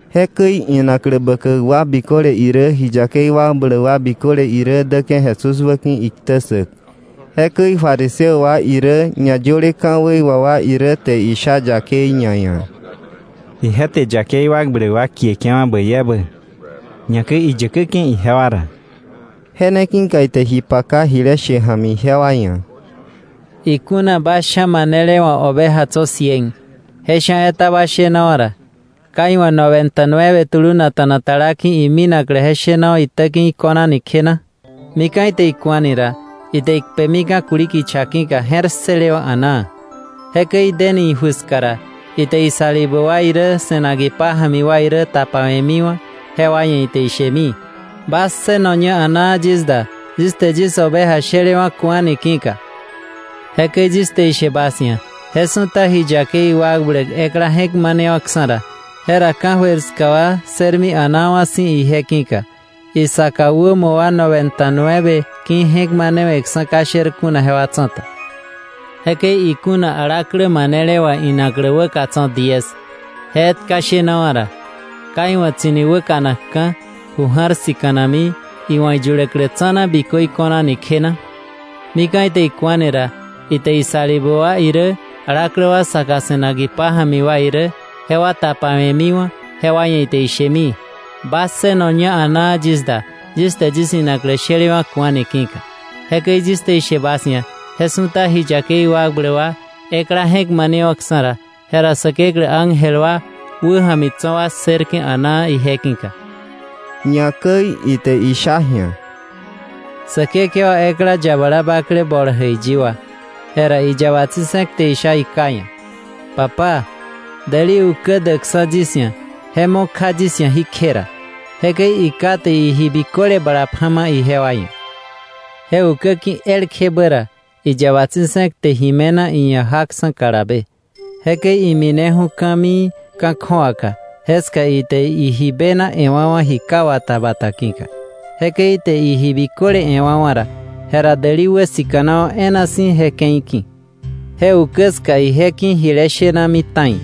Jekäi inaklä bäkäk wa biköle irä ji yakei wakbläk wa biköle irä däke̱ Jesús wäki̱ iktä ssäk. Jekäi fariseo wa irä ñayöle ka̱wei wà wa irä te isha yakei ñaia̱: —Ije te yakei wakbläk wa kieke̱wa̱ bäi ebä, ñakäi iyäkäke̱ ijewa ra. Je ne ki̱ka ite ji paka jile she ja̱mi ijewa ia̱: “Ikuna bas sha̱ manele wa̱ oveja tso̱ cien, je sha̱ etaba shenawa̱ ra, ¿ka iwa̱ noventa y nueve tulunakta̱na tala ki̱ iminaklä je shenawa̱ itäki̱ iko̱nani kje na? Mika̱ ite iku̱ani ra, ite ikpemika̱ kuli kicha ki̱ka je̱r ssëlewa̱ a̱naa. Jekäi ideni iju ska ra, ite isalibä wa irä se̱nak ipája̱mi wa irä tapawe̱miwa̱ jewa ia̱ ite ishemi: ‘Bas ssënoña a̱naa yis da, yis te yis oveja shelewa̱ ku̱ani ki̱ka.’ Jekäi yis te ishe bas ia̱, je su̱ta ji yakei wakbläk ekla je̱k manewa̱ksa̱ ra, jera ka̱jöir ska wa ssërmi a̱naawa̱ si̱ ije ki̱ka, isaka wämo wa noventa y nueve ki̱ je̱k manewe̱ksa̱ ka sher kuna jewa tsa̱ta. “Jekäi ikuna alaklä manele wa̱ inaklä wäka tso̱ diez, je etka shenawa̱ ra, ¿ka iwa̱ tsi̱ni wäkanakka̱, ju ja̱r sika̱nakmi, iwa̱ iyuläklä tsa̱na bikö iko̱nani kje na? Mika̱ ite iku̱ani ra, ite isalibä wa irä alaklä wa saka se̱nak ipája̱mi wa irä jewa tapewe̱mi jewa ia̱ ite ishemi: ‘Bas ssënoña a̱naa yis da, yis te yis inaklä shelewa̱ ku̱ani ki̱ka.’ Jekäi yis te ishe bas ia̱ je su̱ta ji yakei wakbläk wa ekla je̱k manewa̱ksa̱ ra, jera Säkeklä ángel wa wäja̱mi tso̱ wa ssërke̱ a̱naa ije ki̱ka.” Ñakäi ite isha ji̱a: “Säkekewa ekla, yabala bakle bol jäiyi wa, jera iyaba tsi̱se̱k te isha iká ia̱: ‘Papá, däli ukä däkksa̱ yis ia̱ ba duawa̱ ra je mo kja yis ia̱ jí kje ra.’ Jekäi iká te iji biköle bala pja̱ ijewa ia̱. Je ukä ki̱ elkjebä ra iyaba tsi̱se̱k te ji me̱na iia̱ jaksa̱ kalabe. Jekäi imineju̱ ka̱mii ka̱ kju̱awaka jeka ite iji bena e̱wa̱wa̱ ji ka wata bata ki̱ka. Jekäi ite iji biköle e̱wa̱wa̱ ra, jera däli wäsika̱nawa̱ e̱e̱na si̱ je ke̱i ki̱. Je ukä ska ije ki̱ jile shenami ta̱i.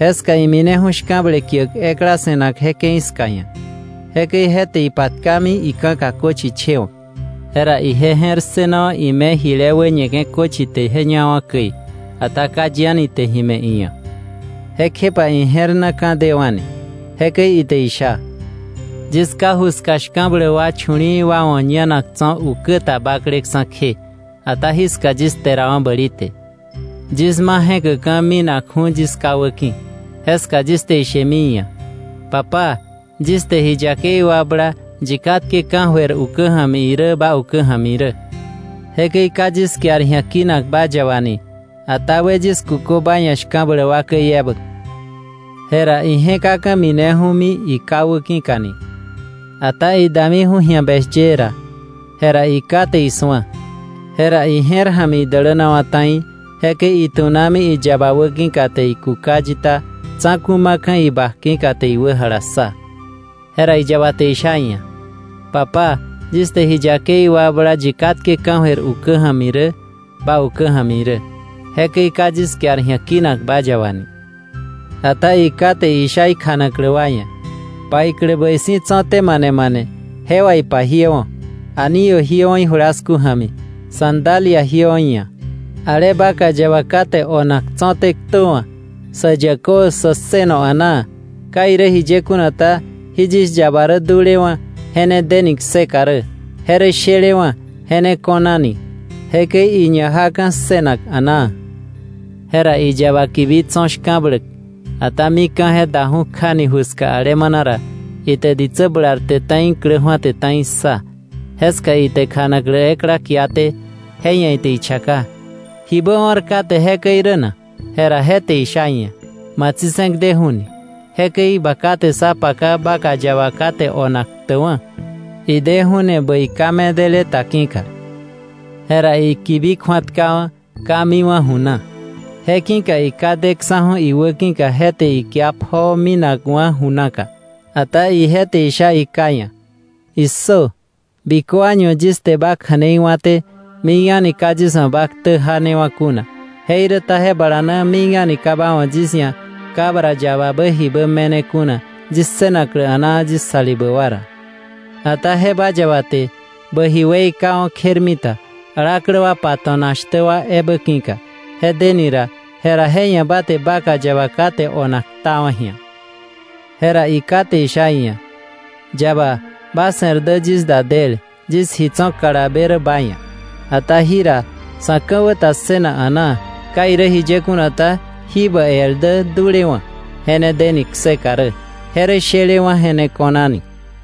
Jeska imineju̱ shka̱ble kiäk ekla se̱nak je ke̱i ska ia̱. Jekäi je te ipatkami ika̱ka köchi chewa̱k. Jera ije je̱r ssënawa̱ ime jile wä ñeke̱ köchi te ñawa̱ käi, ata ka yi a̱ni te ji me̱ iia̱. Jekjepa ije̱r na ka̱ dewa̱ni. Jekäi ite isha: ‘¡Yis ká ju ska shka̱bläk wa chu̱li̱i̱ wa wa̱ ñanak tso̱ ukä ta bakleksa̱ kje, ata jiska yis kterawa̱ bäli te! Yis ma je̱käkka̱ minakju̱ni yis ká wäki̱. Jeska yis te ishemi iia̱: Papá, yis te ji yakei wakbla yi katke ka̱jöir ukä ja̱mi irä ba ukä ja̱mi irä. Jekäi ka yis kiar ji̱a kinak ba yaba ni, ata we yis kukö ba ia̱ shka̱bläk wa käi ebä.’ “Jera ije̱kaka̱ mineju̱mi iká wäki̱kani. Ata idamiju̱ ji̱a beshyee ra, jera iká te isu̱a, jera ije̱r ja̱mi idälänawa̱ ta̱i. Jekäi itu̱nami iyaba wäki̱ka te ikuka yita tsa̱ku̱ ma̱ka̱ ibak ki̱ te iwä jalassa. Jera iyaba te isha iia̱: ‘Papá, yis te ji yakei wakbla yi katke ka̱jöir ukä ja̱mi irä ba ukä ja̱mi irä. Jekäi ka yis kiar ji̱a kinak ba yaba ni.’ Ata iká te isha ikjanaklä wa ia̱: ‘Paiklä bäi si̱ tso̱té, mane mane je wà ipajiöwa̱, anillo jiöwa̱ ijulasku ja̱mi, sandalia jiöwa̱ iia̱. Ale vaca yaba kate onak tso̱té ktöwa̱, sä yäkö, sä ssëno a̱naa. Ka irä jiye kuna ta, jí yis yaba rä dulewa̱ je ne deni kseka rä. Je rä shelewa̱ je ne ko̱nani.’ Jekäi iña jaka̱ ssënak a̱naa. “Jera iyaba kibi tso̱ shka̱bläk, ata mika̱ je daju̱ kjani ju ska alemana ra, ite ditsä bularte ta̱i iklä ju̱ate ta̱i ssa. Jeska ite kjanaklä ekla kiate, je ia̱ ite ichaka: ‘¿Jibä o̱r kate jekäi rä na?’ Jera je te isha iia̱: ‘Ma tsi̱se̱k deju̱ni; jekäi ba ká te sá paka vaca yaba kate onak ktäkwa̱, ideju̱ni bäi ka medele ta ki̱ka.’ Jera ikibi kju̱atkawa̱, ka miwa̱ ju na. Je ki̱ka iká deksa̱ju̱ iwäki̱ka je te ikia pjoo minakwa̱ ju naka. Ata ije te isha iká ia̱: ‘¡Issö! Bikö año yis te ba kja̱nei wa̱té, mik a̱ni ka yis wa̱ bä ktä janewa̱ kuna, jeiräta je bala na mik a̱ni ka ba wa̱ yis ia̱ cabra yababä jibä me̱ne kuna yis ssënaklä a̱naa yis salibä wa ra. Ata je ba yaba te bä ji weikawa̱ kjermita alaklä wa pato̱nak shtä wa ebä ki̱ka deni ra, jera je ia̱ bä te vaca yaba kate onak ktawa̱ ji̱a.’ “Jera iká te isha iia̱: ‘Yaba, ba se̱r dä yis da del. Yis ji tso̱ kalabe rä ba ia̱. Ata jira sa̱ ka̱wä ta ssënak a̱naa. Ka irä jiye kuna ta, jí bä el dä dulewa̱ je ne deni kseka rä; je rä shelewa̱ je ne ko̱nani.’”